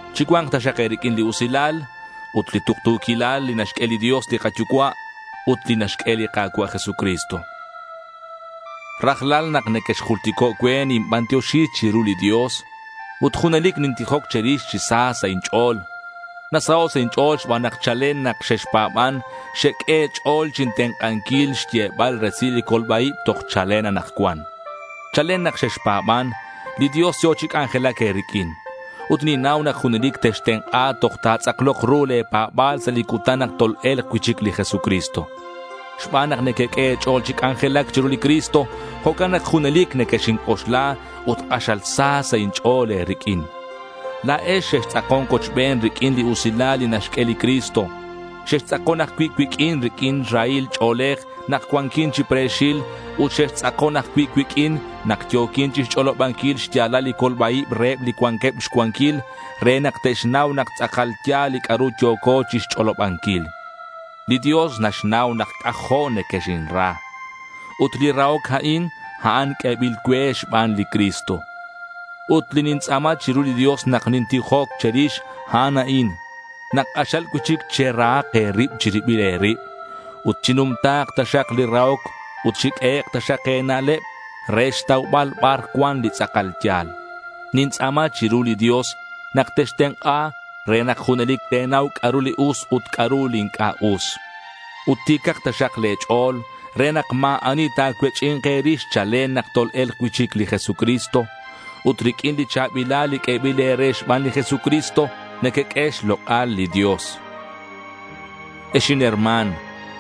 Chicua̱nk taxak e̱riq'uin li usilal ut li tuktu̱quilal li naxq'ue li Dios li kaYucua' ut li naxq'ue li Ka̱cua' Jesucristo. Rajlal nak nequexjultico' cue, ninbantioxi chiru li Dios. Ut junelic nintijoc che̱rix chi sa sa' inch'o̱l. Nasaho' sa' inch'o̱l xban nak chalen nak xexpa̱ban xeq'ue e̱ch'o̱l chintenk'anquil xyebal resil li colba-ib toj chalen anakcuan. Chalen nak xexpa̱ban, li Dios yo̱ chi c'anjelac e̱riq'uin. Ut ninnau nak junelic textenk'a toj ta̱tz'aklok ru le̱ pa̱ba̱l sa' li cutan nak tol-e̱lk cui'chic li Jesucristo. Xban nak nequeq'ue e̱ch'o̱l chi c'anjelac chiru li Cristo, jo'can nak junelic nequexinc'oxla ut k'axal sa sa' inch'o̱l e̱riq'uin. La̱ex xextz'akon cuochben riq'uin li usilal li naxq'ue li Cristo. Xextz'akon ajcui' cuiq'uin riq'uin rahil ch'o̱lej nak cuanquin chi pre̱xil ut xextz'akon ajcui' cuiq'uin nak yo̱quin chixch'olobanquil xya̱lal li colba-ib reheb li cuanqueb xcuanquil re nak te'xnau nak tz'akal ya̱l li c'a'ru yo̱co chixch'olobanquil. Li Dios naxnau nak c'ajo' nequexinra. Ut li rahoc a'in, a'an q'uebil cue xban li Cristo. Ut li nintz'a̱ma chiru li Dios nak nintijoc che̱rix, a'an a'in: nak k'axal cui'chic cherahak e̱rib chi ribil e̱rib. Ut chinumta̱k taxak li rahoc ut chiq'uehek' taxak e̱na'leb re xtaubal bar cuan li tz'akal ya̱l. Nintz'a̱ma chiru li Dios nak textenk'a re nak junelic te̱nau c'a'ru li us ut c'a'ru li inc'a' us. Ut ti̱cak taxak le̱ ch'o̱l re nak ma̱ ani ta̱cuech'i̱nk e̱rix chalen nak tol-e̱lk cui'chic li Jesucristo. Ut riq'uin li cha̱bilal li q'uebil e̱re xban li Jesucristo, nequeq'ue xlok'al li Dios. Ex inherma̱n,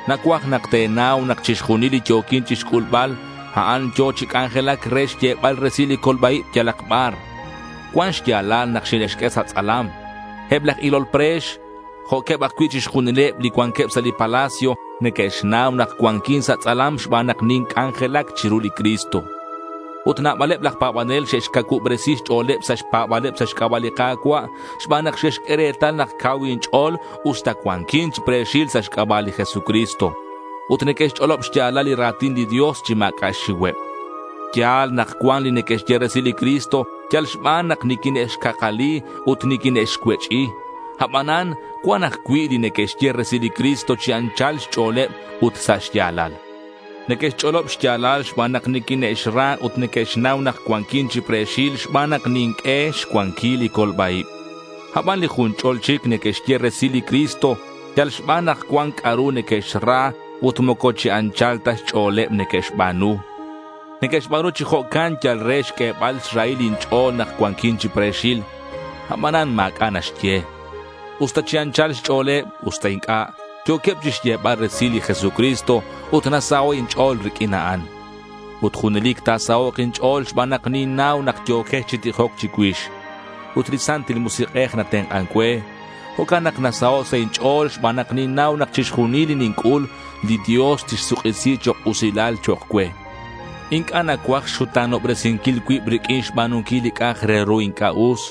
nacuaj nak te̱nau nak chixjunil li yo̱quin chixc'ulbal, a'an yo̱ chi c'anjelac re xyebal resil li colba-ib yalak bar. Cuan xya̱lal nak xine'xq'ue sa' tz'alam. Eb laj ilol pre̱x jo'queb ajcui' chixjunileb li cuanqueb sa' li palacio neque'xnau nak cuanquin sa' tz'alam xban nak ninc'anjelac chiru li Cristo. Ut nabaleb laj pa̱banel xe'xcacuubresi xch'o̱leb sa' xpa̱ba̱leb sa' xc'aba' li Ka̱cua' xban nak xe'xq'ue retal nak cau inch'o̱l usta cuanquin chi pre̱xil sa' xc'aba' li Jesucristo. Ut neque'xch'olob xya̱lal li ra̱tin li Dios chi ma̱c'a' xxiuheb. Ya̱l nak cuan li neque'xye resil li Cristo yal xban nak niquine'xcakali ut niquine'xcuech'i. Abanan cuan ajcui' li neque'xye resil li Cristo chi anchal xch'o̱leb ut sa' xya̱lal. Neque'xch'olob xya̱lal xban nak niquine'xra ut neque'xnau nak cuanquin chi pre̱xil xban nak ninq'ue xcuanquil li colba-ib. Aban li jun ch'ol chic neque'xye resil li Cristo yal xban nak cuan c'a'ru neque'xra ut moco chi anchal ta xch'o̱leb neque'xba̱nu. Neque'xba̱nu chi jo'can yal re xq'uebal xrahil inch'o̱l nak cuanquin chi pre̱xil. Abanan ma̱c'a' naxye. Usta chi anchal xch'o̱leb, usta inc'a', yo̱queb chixyebal resil li Jesucristo. Ut nasaho' inch'o̱l riq'uin a'an. Ut junelic ta̱sahok' inch'o̱l xban nak ninnau nak yo̱quex chi tijoc chicuix. Ut li Santil Musik'ej natenk'an cue. Jo'can nak nasaho' sa' inch'o̱l xban nak ninnau nak chixjunil li ninc'ul, li Dios tixsuk'isi chok' usilal chok' cue. Inc'a' nacuaj xxuta̱nobresinquil cuib riq'uin xba̱nunquil li c'a'ak re ru inc'a' us.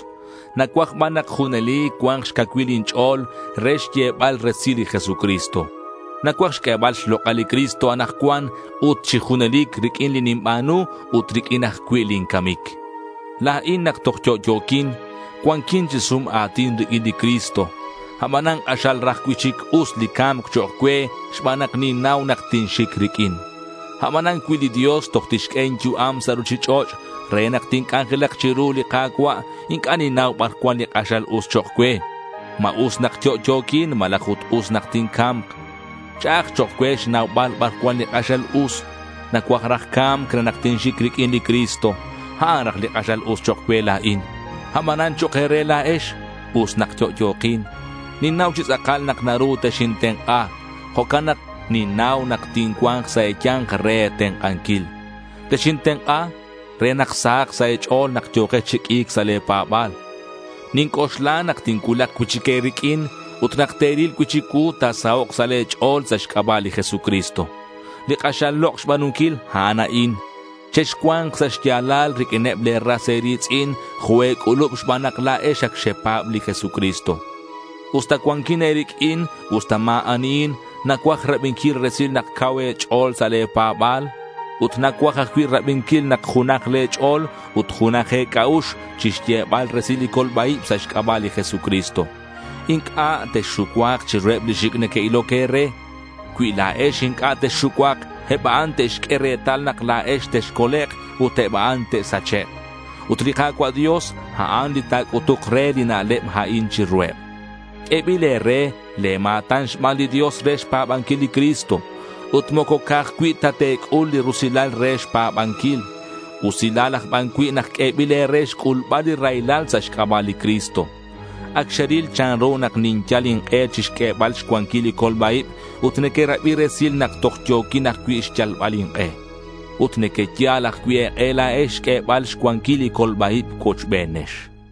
Nacuaj ban nak junelic cua̱nk xcacuilal inch'o̱l re xyebal resil li Jesucristo. Nacuaj xq'uebal xlok'al li Cristo anakcuan ut chi junelic riq'uin li ninba̱nu ut riq'uin ajcui' lin camic. La̱in, nak toj yo'yo̱quin, cuanquin chi sum a̱tin riq'uin li Cristo. Abanan k'axal raj cui'chic us li ca̱mc chok' cue xban nak ninnau nak tinxic riq'uin. Abanan cui li Dios toj tixq'ue inyu'am sa' ruchich'och' re nak tinc'anjelak chiru li Ka̱cua', inc'a' ninnau bar cuan li k'axal us chok' cue. ¿Ma us nak yo'yo̱quin malaj ut us nak tinca̱mk? Ch'a'aj chok' cue xnaubal bar cuan li k'axal us. Nacuaj raj ca̱mc re nak tinxic riq'uin li Cristo. A'an raj li k'axal us chok' cue la̱in. Abanan chok' e̱re la̱ex, us nak yo'yo̱kin. Ninnau chi tz'akal nak naru texintenk'a. Jo'can nak ninnau nak tincua̱nk sa' e̱ya̱nk re e̱tenk'anquil. Texintenk'a re nak sahak sa' e̱ch'o̱l nak yo̱kex chi q'ui̱c sa' le̱ pa̱ba̱l. Ninc'oxla nak tincuulak cui'chic e̱riq'uin ut nak te̱ril cui'chic cuu, ta̱sahok' sa' le̱ ch'o̱l sa' xc'aba' li Jesucristo. Li k'axal lok' xba̱nunquil, a'an a'in: Chexcua̱nk sa' xya̱lal riq'uineb le̱ ras e̱ri̱tz'in jo' e̱c'ulub xban nak la̱ex ac xepa̱b li Jesucristo. Usta cuanquin e̱riq'uin, usta ma̱ anihin, nacuaj rabinquil resil nak cau e̱ch'o̱l sa' le̱ pa̱ba̱l. Ut nacuaj ajcui' rabinquil nak junaj le̱ ch'o̱l ut junaj e̱c'a'ux chixyebal resil li colba-ib sa' xc'aba' li Jesucristo. Inc'a' texxucuak chiruheb li xic' neque'iloc e̱re. Cui la̱ex inc'a' texxucuak, eb a'an te'xq'ue retal nak la̱ex texcolek' ut eb a'an te'sachek'. Ut li Ka̱cua' Dios, a'an li ta̱c'utuk re li na'leb a'in chiruheb. Q'uebil e̱re le̱ ma̱tan xban li Dios re xpa̱banquil li Cristo. Ut moco ca'aj cui' ta te̱c'ul li rusilal re xpa̱banquil. Usilal aj ban cui' nak q'uebil e̱re xc'ulbal li raylal sa' xc'aba' li Cristo. Ac xeril chanru nak ninyal ink'e chixq'uebal xcuanquil li colba-ib ut nequerabi resil nak toj yo̱quin ajcui' xyalbal ink'e. Ut nequeyal ajcui' e̱k'e la̱ex xq'uebal xcuanquil li colba-ib cuochbenex.